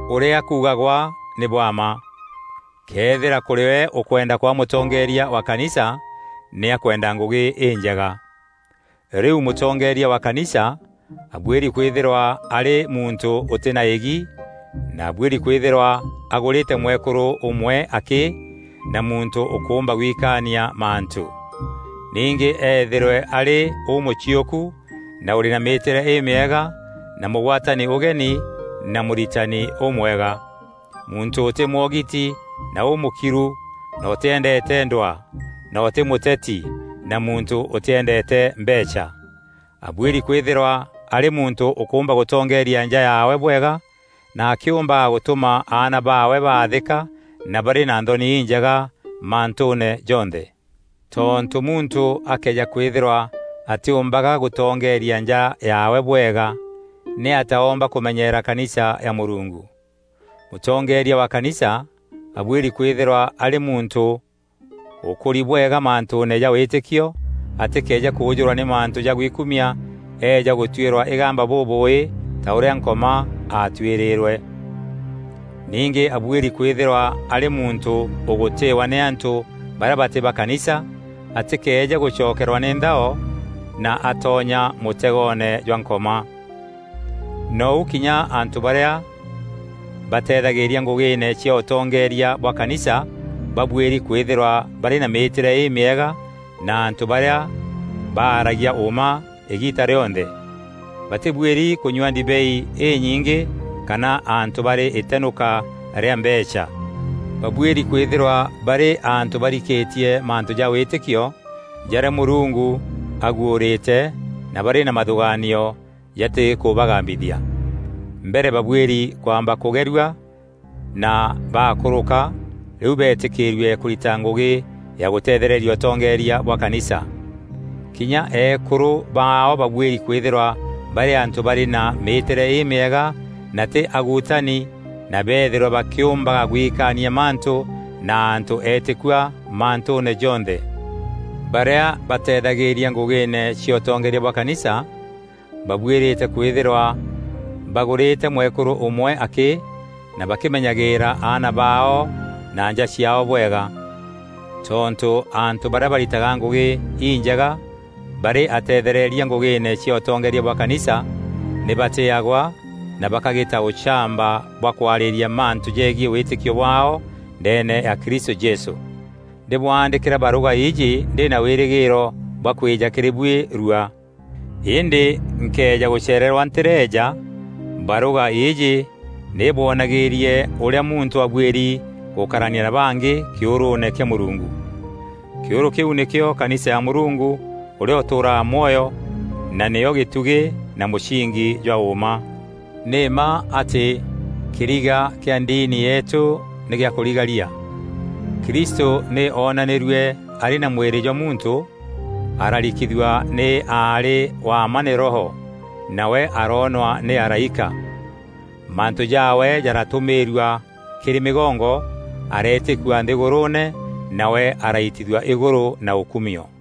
Ûrîa kuugagwa nî bwa mma: këethîra kûrîwe ûkwenda kwaa mûtongeeria wa kanisa, nî akwenda ngûgî înjega. Rîu mûtongeeria wa kanisa abuîri kwîthîrwa arî muntû ûtî na îgi na abuîri kwîthîrwa agûrîte mwekûrû ûmwe akî na muntû ûkûûmba gwikaania mantû. Ningî eethîrwe arî ûmûciûku na ûrî na mîîtîre îmîega na mûgwatani ûgeni na mûritani ûmwega, muntû ûtî mwogiti na ûmûkiru na ûtîendeete ndwaa na ûtî mûteti na muntû ûtîendeete mbeecha. Abuîri kwîthîrwa arî muntû ûkûûmba gûtongeeria nja yaawe bwega na akîûmbaga gûtûma aana baawe baathîka na barî na nthoni injega mantûûne jonthe. Tontû muntû akëeja kwîthîrwa atîûmbaga gûtongeeria nja yaawe bwega, nîatîa oomba kûmenyeera kanisa ya Mûrungu? Mûtongeeria wa kanisa abuîri kwîthîrwa arî muntû ûkûri bwega mantûûne ja wîtîkio, atîkeeje kûûjûrwa nî mantû ja gwikumia eeja gûtuîrwa îgamba bûbûûî ta ûrîa Nkoma aatuîrîîrwe. Ningî abuîri kwîthîrwa arî muntû ûgûtîîwa nî antû barîa batî ba kanisa, atîkeeje gûcokerwa nî nthao na atonya mûtegoone jwa Nkoma. Nou kinya antû barîa bateethagîîria ngûgîîne cia ûtongeeria bwa kanisa babuîri kwîthîrwa barî na mîîtîre îmîega na antû barîa baragia ûûma îgiita rîonthe. Batîbuîri kûnyua ndibei înyingî kana antû barî îtenûka rîa mbeecha. Babuîri kwîthîrwa barî antû barikîtie mantû ja wîtîkio jarîa Mûrungu aguûrîte na barî na mathûgaanio jatîkûbagambithia. Mbere babuîri kwamba kûgerua na baakûrûka rîu beetîkîrue kûrita ngûgî ya gûteethereria ûtongeeria bwa kanisa. Kinya eekûrû baao babuîri kwîthîrwa barî antû barî na mîîtîre îmîega na tî aguutani na beethîrwe bakîûmbaga gwikaania mantû na antû eetîkua mantûûne jonthe. Barîa bateethagîria ngûgîîne cia ûtongeeria bwa kanisa, babuîrîte kwîthîrwa bagûrîte mwekûrû ûmwe akî na bakîmenyagîîra aana baao na nja ciaao bwega. Tontû antû barîa baritaga ngûgî injega barî ateethereria ngûgîîne cia ûtongeeria bwa kanisa nî batîîagwa na bakagîta ûchamba bwa kwarîîria mantû jegiî wîtîkio bwaao ndeene ya Kristû Jesû. Ndîbwaandîkîra barûga îîjî ndî na wîrîgîîro bwa kwîja kîrî buî rua. Îndî nkëeja gûcereerwa ntîreeja, barûga îîjî nî îbwonagîîrie ûrîa muntû abuîri gûkarania na bangî kîûrûûne kîa Mûrungu. Kîûrû kîu nîkîo kanisa ya Mûrungu ûrîa ûtûûraga mwoyo na nîyo gîtugî na mûsingi jwa ûûma. Nî mma atî kîriga kîa ndini yeetû nî gîa kûrigaria: Kristû nî onanîrue arî na mwîrî jwa muntû, ararikithua nî aarî wa mma nî Roho, nawe aroonwa nî araîka. Mantû jaawe jaratûmîîrua kîrî mîgongo, areetîkua nthîgûrûûne, nawe araitithua îgûrû na ûkumio.